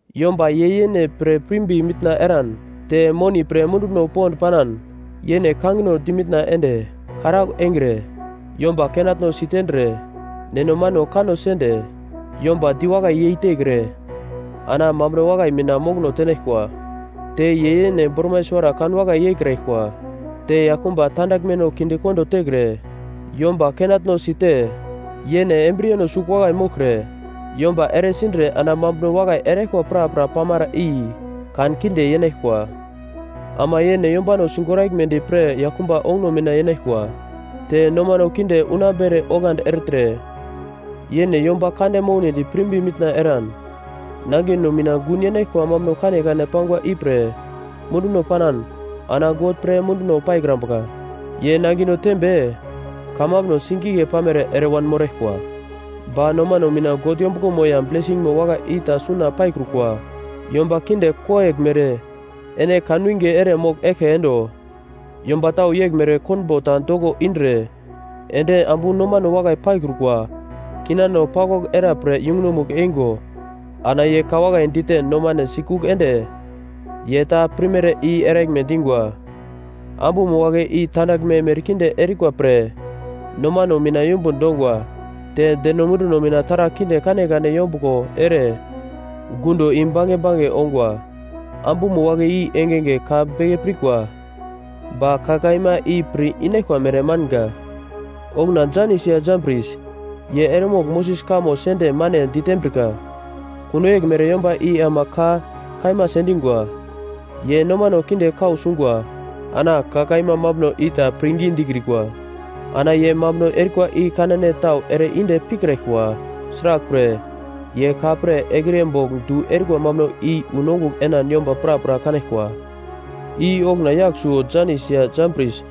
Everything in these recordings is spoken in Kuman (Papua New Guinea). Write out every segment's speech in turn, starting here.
Yomba ye yene pre pirmbi mitna eran, te moni pre munduno pond panan, yene kangino dimitna ende, karaugl engre, yomba kenatnosi tendre, neno mano kanno sende, yomba diwakai yeitekre, ana mambuno wakai mina mokono tenaglkwa. Te ye yene bormai suwara kan wakai yeikraglkwa, te yaglkumba tandaglmeno kinde kondo tekre, yomba kenatno site, yene embriyeno sugl wakai moglkre, yomba ere sindre ana mambuno wakai eraglkwa prapra pamara i kankinde yenaglkwa. Ama yene yombano sigoraglmedi pre yaglkumba onguno mina yenaglkwa, te nomano kinde unambere oglandi ertre, yene yomba kande mounedi pirmbi mitna eran, nangino mina gun yenaglkwa mambuno kanekane pangwa ipre munduno panan, ana God pre munduno paikrambuka. Ye nangino tembe kamambuno singigle pamere ere wanmoraglkwa, ba nomano mina God yombuglomo ya blesingmo wakai i ta suna paikrukwa. Yomba kinde koyeglmere ene kanwinge ere mogl eglke endo. Yomba tau yeglmere konbo ta doko indre, ende ambu nomano wakai paikrukwa, kinano paglwagl era pre yungunomugl eingo, ana ye ka wakai dite nomane sikugl ende, ye ta pirmere i eraglme dingwa. Ambumo wagle i tandaglme merkinde erikwa pre nomano mina yumbun dongwa. Te deno munduno mina taragl kinde kanekane yombuglo ere gundo i-bange bange ongwa. Ambumo wagle i engenge ka beke pirkwa, ba ka kaima i pir inaglkwa mere manga. Okuna Janis ya Jambris, ye eremogl Moses kamo sende mane ditembrika, kuno yeglmere yomba i ama ka kaima sendingwa. Ye nomano kinde kau sungwa ana ka kaima mambuno i ta pirngi dikrikwa. Ana ye mambuno erikwa i kanane tau ere inde pikraglkwa, sraglpre ye ka pre ekriye bogl du erikwa mambuno i wu nongugl enan yomba prapra kanaglkwa. I okuna yagl suwo Janis ya Jambris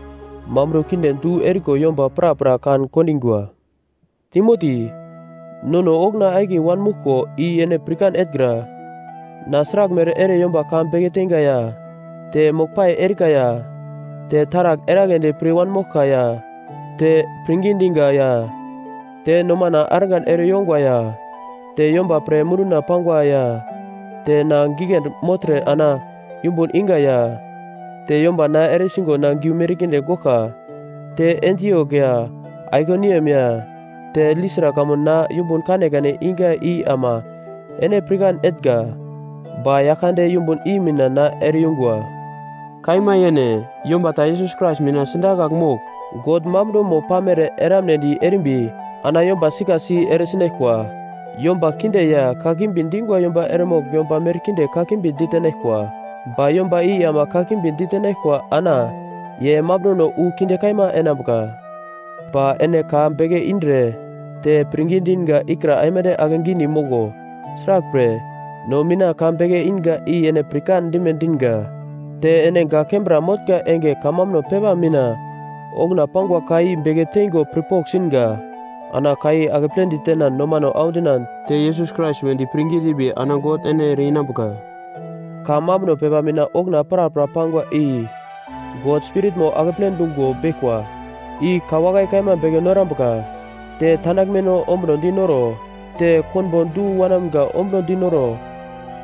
mambuno kinde du eriko yomba prapra kan-kondingwa. Timoti, nono okuna akiye wanmouglko i ene pirkan etngra, na sraglmere ere yomba ka beke teinga, ya te moglpai erika, ya te taragl eragledi pir wanmoglka ya te pirngi diga, ya te nomana argan ere yongwa ya te yomba pre munduna pangwa ya te na giglendi mogltre ana yumbun iga, ya te yomba na ere sigo ana giu merkinde goglka te Antiok ya Aikoniam ya te Listra kamun na yumbun kanekane iga i ama ene pirkan etnga. Ba Yaglkande yumbun i mina na ere yungwa. Kaima yene, yomba ta Yesus Krais mina sidakagl mogl God mambunomo pamere eramnedi erimbi ana yomba sikasi eresinaglkwa. Yomba kinde ya kakimbi dingwa yomba eremogl yomba merkinde kakimbi ditenaglkwa. Ba yomba i ama kakimbi ditenaglkwa ana ye mambunono wu kinde kaima enambuka. Ba ene ka beke indre te pirngi dinga ikra aimande ake gidi moglo, sraglpre no mina ka beke inga i ene pirkan dime dinga. Te ene gak kembra motnga enge kamambuno pepa mina okuna pangwa ka i beke teingo pirpogl singa. Ana ka i akeple ditenan nomano audinan te Yesus Krais wedi pirngi dimbi ana God ene ere-inambuka. Ka mambuno pepa mina okuna prapra pangwa i God Spiritmo akeple dungo beglkwa. I ka wakai kaima beke norambuka, te tandaglmeno ombunodi noro, te konbo du wanamga ombuno dinoro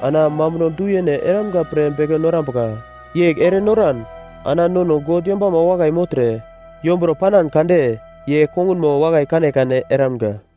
ana mambuno du-yene eramga pre beke norambuka. Yegl ere noran ana nono God yombama wakai mogltre, yombro panan kande ye kongunmo wakai kanekane eramga.